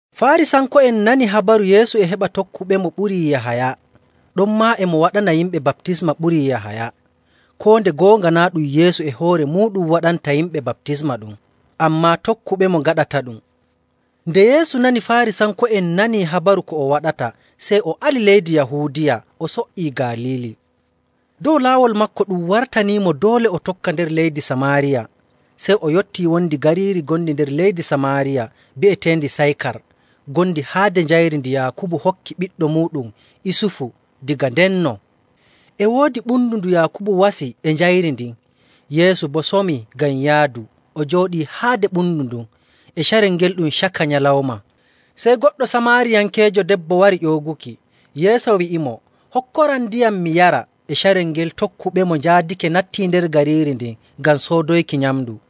Faarisanko'en nani habaru Yeesu e heɓa tokkuɓemo ɓurii Yahaya, ɗonmaa e mo waɗana yimɓe baptisma ɓurii Yahaya, (koo nde goonga naa' ɗum Yeesu e hoore muuɗum waɗanta yimɓe baptisma ɗum, ammaa tokkuɓemo ngaɗataɗum.) Nde Yeesu nani Faarisanko'en nanii habaru ko o waɗata, sey o ali leydi Yahuudiya, o so''ii Galiili. Dow laawol maako ɗum wartanimo doole o tokka nder leydi Samaariya. Sey o yottii wondi gariiri ngondi nder leydi Samaariya bi'eteendi Saykar ngondi haade njayri ndi Yaakubu hokki ɓiɗɗo muuɗum Isufu daga ndenno.. E woodi ɓundu ndu Yaakubu wasi e njayri ndin. Yeesu boo somii ngam yaadu o jooɗii haade ɓundu ndun. E carel ngel ɗum caka nyalawma. Sey goɗɗo Samaariyankeejo debbo warii ƴooguki, Yeesu wi'imo, “Hokkoram ndiyam mi yara.” E carel ngel tokkuɓemo njaadake nattii nder gariiiri ndin ngam soodoyki nyamndu.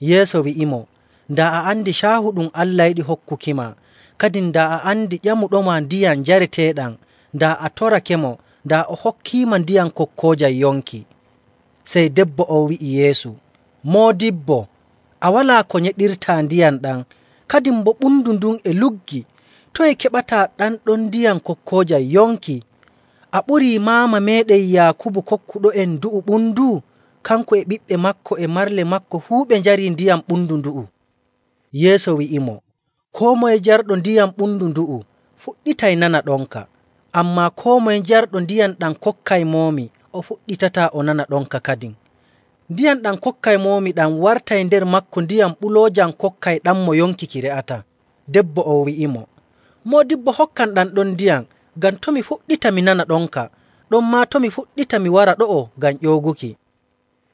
Yeesu wi'imo, “Daa a andi caahu ɗum Allah yiɗi hokkukima, kadin daa a andi ƴamuɗoma ndiyam njareteeɗam, daa a torakemo, daa o hokkiima ndiyam kokkoojam yonki.” Sey debbo on wi'i Yeesu, “Moodibbo, a walaa ko nyeɗirtaa ndiyam ɗam, kadin boo ɓundu ndun e luggi. Toye keɓataa ɗam ɗon ndiyam kokkoojam yonki? A ɓurii maama meeɗen Yaakubu kokkuɗo'en ndu'u ɓundu? Kanko e ɓiɓɓe maako e marle maako fuu ɓe njarii ndiyam ɓundu ndu'u.” Yeesu wi'imo, “Koo moye jarɗo ndiyam ɓundu ndu'u fuɗɗitay nana ɗonka, ammaa koo moye jarɗo ndiyam ɗam kokkaymoomi o fuɗɗitataa o nana ɗonka kadin. Ndiyam ɗam kokkaymoomi ɗam wartay nder maako ndiyam ɓuloojam kokkayɗammo yonki ki re'ataa.” Debbo on wi'imo, “Moodibbo, hokkam ɗam ɗon ndiyam ngam to' mi fuɗɗita mi nana ɗonka, ɗonmaa to' mi fuɗɗita mi wara ɗo'o ngam ƴooguki.”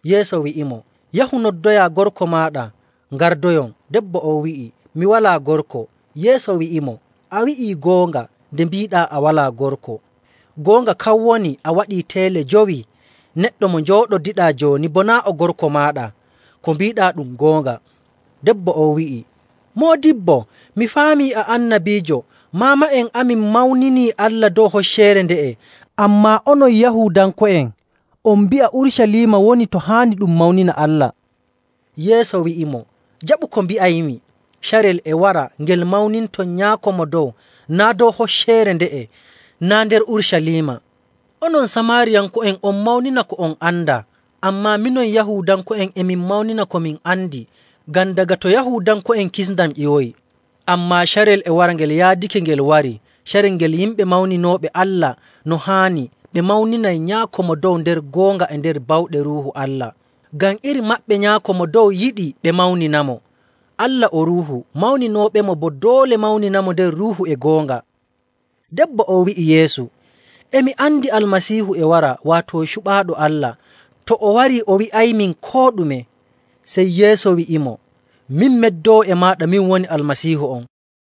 Yeesu wi'imo, “Yahu noddoyaa gorko maaɗa, ngardoyon.” Debbo on wi'i, “Mi walaa gorko.” Yeesu wi'imo, “A wi'ii goonga nde mbiiɗaa a walaa gorko. Goonga kan woni a waɗii teele jowi, neɗɗo mo njooɗodiɗaa jooni boo naa' o gorko maaɗa. Ko mbiiɗaa ɗum goonga.” Debbo on wi'i, “Moodibbo, mi faamii a annabiijo. Maama'en amin mawninii Allah dow hocceere nde'e, ammaa onon Yahuudanko'en on mbi'a Urucaliima woni to haani ɗum mawnina Allah.” Yeesu wi'imo, “Jaɓu ko mbi'aymi, carel e wara ngel mawninton Nyaako Mo Dow naa' dow hocceere nde'e naa' nder Urucaliima. Onon Samaariyanko'en on mawnina ko on andaa, ammaa minon Yahuudanko'en e min mawnina ko min andi, ngam daga to Yahuudanko'en kisndam ƴiwoyi. Ammaa carel e wara, ngel yaadake ngel warii, carel ngel yimɓe mawninooɓe Allah no haani ɓe mawninay Nyaako Mo Dow nder goonga e nder bawɗe Ruuhu Allah, ngam iri maɓɓe Nyaako Mo Dow yiɗi ɓe mawninamo. Allah o Ruuhu, mawninooɓemo boo doole mawninamo nder Ruuhu e goonga.” Debbo on wi'i Yeesu, “E mi andi Almasiihu e wara, waato Cuɓaaɗo Allah. To o warii, o wi'aymin koo ɗume.” Sey Yeesu wi'imo, “Min meddoowo e maaɗa, min woni Almasiihu on.”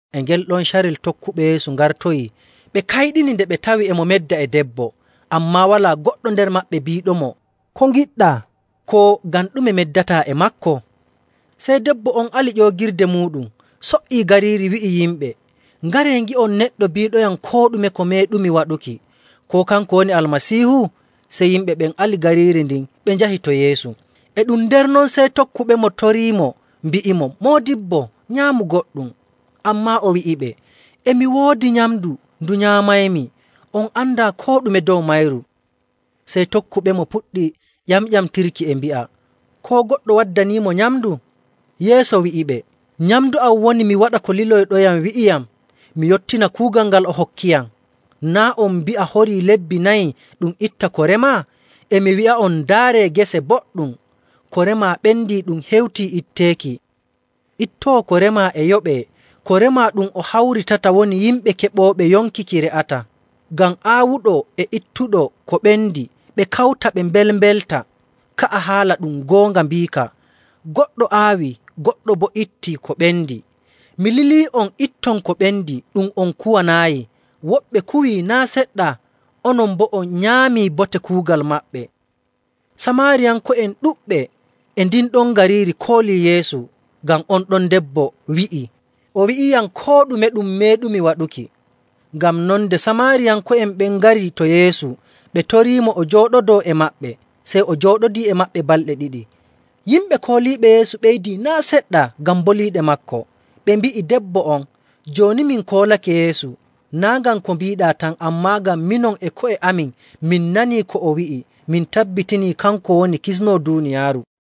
E ngel ɗon carel tokkuɓe Yeesu ngartoyi, ɓe kayɗini nde ɓe tawi e mo medda e debbo. Ammaa walaa goɗɗo nder maɓɓe biiɗomo, “Ko ngiɗɗaa?” Koo, “Ngam ɗume meddataa e maako?” Sey debbo on ali ƴoogirde muuɗum, so''ii gariiri wi'i yimɓe, “Ngaree, ngi'on neɗɗo biiɗoyam koo ɗume ko meeɗumi waɗuki. Koo kanko woni Almasiihu?” Sey yimɓe ɓen ali gariiri ndin ɓe njahi to Yeesu. E ɗum nder non sey tokkuɓemo toriimo mbi'imo, “Moodibbo, nyaamu goɗɗum.” Ammaa o wi'iɓe, “E mi woodi nyamndu ndu nyaamaymi, on andaa koo ɗume dow mayru.” Sey tokkuɓemo puɗɗi ƴamƴamtirki e mbi'a, “Koo goɗɗo waddaniimo nyamndu?” Yeesu wi'iɓe, “Nyamndu am woni mi waɗa ko lilɗoyam wi'iyam, mi yottina kuugal ngal o hokkiyam. Naa' on mbi'a, ‘Horii lebbi nayi ɗum itta ko remaa?’ E mi wi'a'on, ndaaree gese boɗɗum. Ko remaa ɓendii ɗum hewtii itteeki. Ittoowo ko remaa e yoɓee, ko remaa ɗum o hawritata woni yimɓe keɓooɓe yonki ki re'ataa, ngam aawuɗo e ittuɗo ko ɓendi ɓe kawta ɓe mbelmbelta. Ka'a haala ɗum goonga biika, ‘Goɗɗo aawii, goɗɗo boo ittii ko ɓendi.’ Mi lilii'on itton ko ɓendi ɗum on kuwanaayi. Woɓɓe kuwii naa' seɗɗa, onon boo on nyaamii bote kuugal maɓɓe.” Samaariyanko'en ɗuɗɓe e ndin ɗon gariiri koolii Yeesu ngam on ɗon debbo wi'ii, “O wi'iiyam koo ɗume ɗum meeɗumi waɗuki.” Ngam non, nde Samaariyanko'en ɓen ngari to Yeesu, ɓe toriimo o jooɗodoo e maɓɓe. Sey o jooɗodii e maɓɓe balɗe ɗiɗi. Yimɓe kooliiɓe Yeesu ɓeydii naa' seɗɗa ngam boliiɗe maako. Ɓe mbi'i debbo on, “Jooni min koolake Yeesu, naa' ngam ko mbiiɗaa tan, ammaa ngam minon e ko'e amin min nanii ko o wi'i, min tabbitinii kanko woni Kisnoowo duuniyaaru.”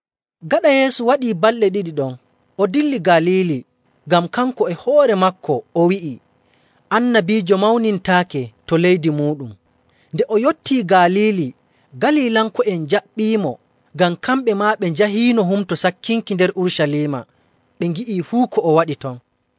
Gaɗa Yeesu waɗii balɗe ɗiɗi ɗon, o dilli Galiili, ngam kanko e hoore maako o wi'i, “Annabiijo mawnintaake to leydi muuɗum.”. Nde o yottii Galiili, Galilanko'en njaɓɓiimo, ngam kamɓe maa ɓe njahiino Humto Sakkinki nder Urucaliima, ɓe ngi'ii fuu ko o waɗi ton..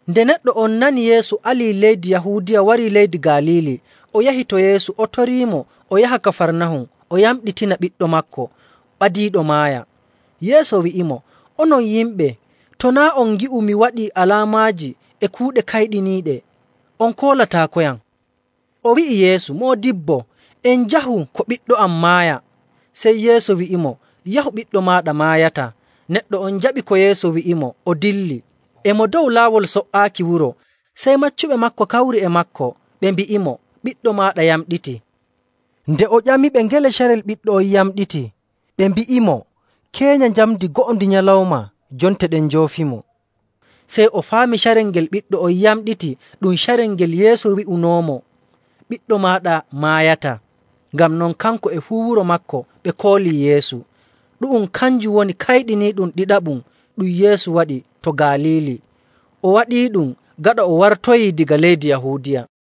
Nde neɗɗo on nani Yeesu alii leydi Yahuudiya warii leydi Galiili, o yahi to Yeesu o toriimo o yaha Kafarnahum o yamɗitina ɓiɗɗo maako ɓadiiɗo maaya. Yeesu wi'imo, “Onon yimɓe to naa' on ngi'u mi waɗii alaamaaji e kuuɗe kayɗiniiɗe, on koolataakoyam.” O wi'i Yeesu, “Moodibbo, en njahu ko ɓiɗɗo am maaya.” Sey Yeesu wi'imo, “Yahu, ɓiɗɗo maaɗa maayataa.” Neɗɗo on jaɓi ko Yeesu wi'imo, o dilli. E mo dow laawol so''aaki wuro, sey maccuɓe maako kawri e maako ɓe mbi'imo, “Ɓiɗɗo maaɗa yamɗitii.” Nde o ƴamiɓe ngele carel ɓiɗɗo on yamɗiti, ɓe mbi'imo, “Keenya njamndi go'o ndi nyalawma jonte ɗen njoofimo.” Sey o faami carel ngel ɓiɗɗo on yamɗiti ɗum carel ngel Yeesu wi'unoomo, “Ɓiɗɗo maaɗa maayataa.” Ngam non, kanko e fuu wuro maako ɓe koolii Yeesu. Ɗu'um kanjum woni kayɗiniiɗum ɗiɗaɓum ɗum Yeesu waɗi to Galiili. O waɗiiɗum gaɗa o wartoyii daga leydi Yahuudiya.